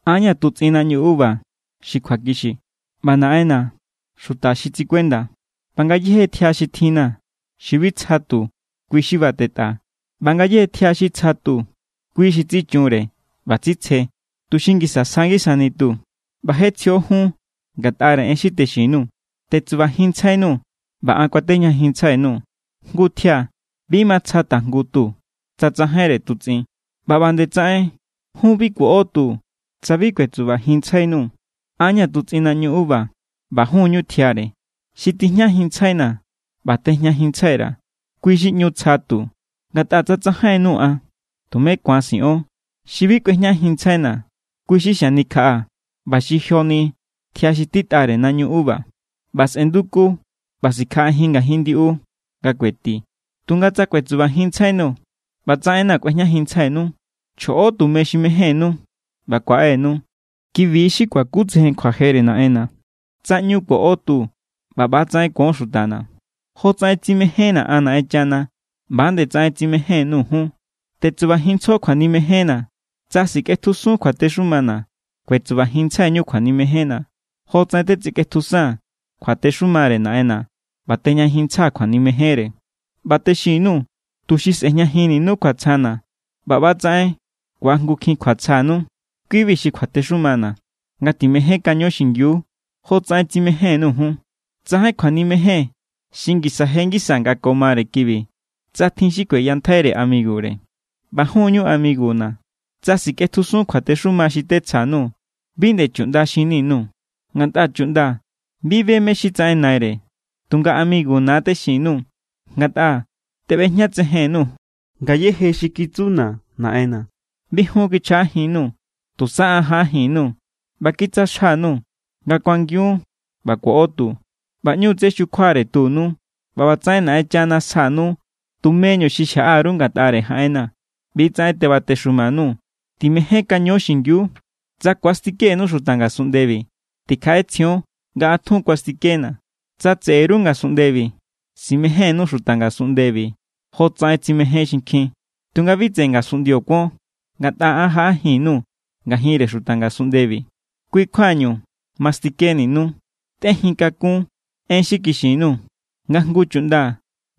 ’An= ña̱ tutsꞌin naꞌñu uva xi kjuakixi, ꞌba Naꞌenna̱= xuta xi tsikuenda. ꞌBa ngayéje tjia xi tjinna̱ xi bi tsja tu, kui= xi batetꞌaa̱. ꞌBa ngayéje tjia xi tsja tu, kui xi tsichunre ꞌba tsitsje, tuxi ngisa sja ngisani tu. ꞌBa je tsjio jun ngatꞌare en xi texin_nuu̱. Tetsubajinntsjainuu̱, ꞌba an kuatejñajinntsjai_nuu̱. Jngu tjia bi ma tsja tajngu tu tsa tsajainre tutsꞌin. ꞌBa ꞌba nde tsaꞌen jun bi kuoꞌo tu tsa bi kuetsubajinntsjainuu̱. ’An= ña̱ tutsꞌin naꞌñu uva, ꞌba jun= ñu tjiare. Xi tijñajinntsjaina̱ ꞌba tejñajinntsjai_ra̱, kui= xi ꞌñu tsja tu. Ngatꞌa tsa tsajainnuu̱ an, tumé ku̱an siꞌon. Xi bi kꞌuejñajinntsjaina̱, kui= xi xanikjaꞌa ꞌba xi̱ joni tjia xi titꞌare naꞌñu uva. ꞌBa sꞌe̱nduku ꞌba sikjaꞌajin ngajin ndiꞌu nga kueti. ’Tunga tsa kuetsubajinntsjainuu̱ ꞌba tsa enna̱ kꞌuejñajinntsjainu, chjoꞌo tume xi mejénnú ꞌba kuaꞌe=nu. Ki=bi xi kuakutsejen kjuajere Naꞌenna̱, tsa ꞌñu ku̱oꞌo tu ꞌba ꞌba=tsaꞌen ku̱on xutana̱. Jotsaꞌen tsimejénna̱ an Naꞌenchana, ꞌba=nde tsaꞌen tsimején_nuu̱ jun. Tetsubajinntsjo kjuanimejenna̱. Tsa sikꞌetjusun kjuatexumana̱, kuetsubajinntsjaiñu kjuanimejenna̱, jotsaꞌen tetsikꞌetjusaa̱n kjuatexumare Naꞌenna̱ ꞌba tejñajinntsjaa̱ kjuanimejenre. ’ꞌBa texin_nuu̱, tuxi sꞌe̱jñajinninu kjuatsjana̱ ꞌba ꞌba=tsaꞌen ku̱ajngukjin kjuatsjanu. Kui=bi xi kjuatexumana̱: Ngatimejénkaño xingiu jotsaꞌen tsimején_nuu̱ jun. Tsajain kjuanimejen xi ngisa je ngisa nga ko mare kibi, tsa tjin xi kueyantjai amigure. ꞌBa jun= ñu amiguna̱ tsa sikꞌetjusun kjuatexuma xi tetsja_nuu̱. Bi nde chuꞌnda xinni_nuu̱, ngatꞌa chuꞌnda bi be mé= xi tsaꞌen naire. Tunga amiguna̱= texin_nuu̱, ngatꞌa teꞌbejñatsejen_nuu̱ ngayéje xi kitsuna̱ Naꞌenna̱. Bi jun kichjaꞌajinnuu̱. Tusa an jaꞌajin_nuu̱ ꞌba kitsja xa_nuu̱ nga kuangiun ꞌba kuoꞌo tu, ꞌba ꞌñu tsé xukjuare tunu. ꞌBa ꞌbatsaꞌen Naꞌenchana sjanu tumeñu xi xjaꞌa_ru ngatꞌare jaꞌenna̱. ꞌBi= tsaꞌen tebatexuma_nuu̱: Timejénkaño xingiu. ’Tsa ku̱astikenu xuta ngasunꞌndebi, tikjaꞌetsjion nga an tjun kuastikena̱. Tsa tseꞌe_ru ngasunꞌndebi, simejénnu xuta ngasunꞌndebi jotsaꞌen tsimején xinkjin. Tunga bi tseꞌe ngasunꞌndio kuon, ngatꞌa an jaꞌajin_nuu̱ ngajinre xuta ngasunꞌndebi. Kui= kjuañu mastikeninu. Tꞌejinkakún en xi kixin_nuu̱, nga jngu chuꞌnda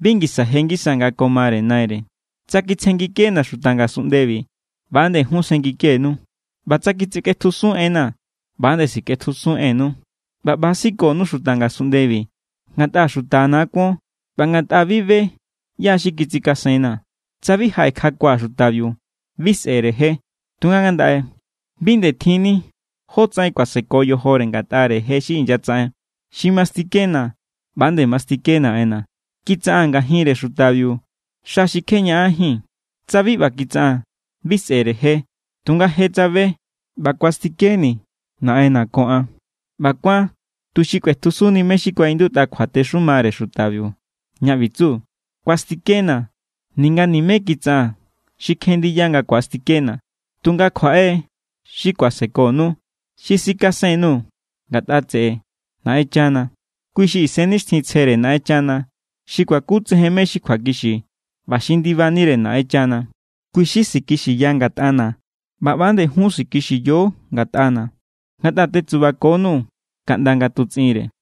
bi ngisa je ngisa nga ko mare naire. Tsa kitsjenngikena̱ xuta ngasunꞌndebi, ꞌba=nde jun sjenngikenu. ꞌBa tsa kitsikꞌetjusun enna̱, ꞌba=nde sikꞌetjusun ennu. ꞌBa ꞌba= sikonu xuta ngasunꞌndebi ngatꞌa xutana̱= kuon ꞌba ngatꞌa bi be ꞌyá= xi kitsikasenna̱. ’Tsa bi jaꞌekjakua̱ xutabiu, bi sꞌe̱re je. Tunga ngandaꞌe bi nde tjinni jótsaꞌen kuaseko yojore ngatꞌare je xi inyatsaꞌen. Xi mastikena̱, ꞌba=nde mastike Naꞌenna̱. Kitsaꞌaa̱n ngajinre xutabiu xa xi kje ñaꞌanjín. Tsa bi ꞌba kitsaꞌaa̱n, bi sꞌe̱re je. Tunga je tsabe ꞌba kuastikeni̱ Naꞌenna̱ ko an. ꞌBa kuán tuxi kꞌuetjusunni mé= xi kuaꞌindutꞌa kjuatexumare xutabiu, ña ꞌbi tsu: “Kuastikena̱ ninga nimé kitsaꞌaa̱n xi kjen ndiya nga ku̱astikena̱.” ’Tunga kjuaꞌe= xi kuasekonu, xi sikasen_nuu̱ ngatꞌa tseꞌe Naꞌenchana. Kui xi Isennixtjintsjere Naꞌenchana xi kuakutsejen mé= xi kjuakixi ꞌba xi ndibanire Naꞌenchana. Kui= xi sikixiya ngatꞌana̱. ꞌBa ꞌba=nde jun sikixiyo ngatꞌana̱, ngatꞌa tetsubakonuu̱ ꞌndani nga tutsꞌinre.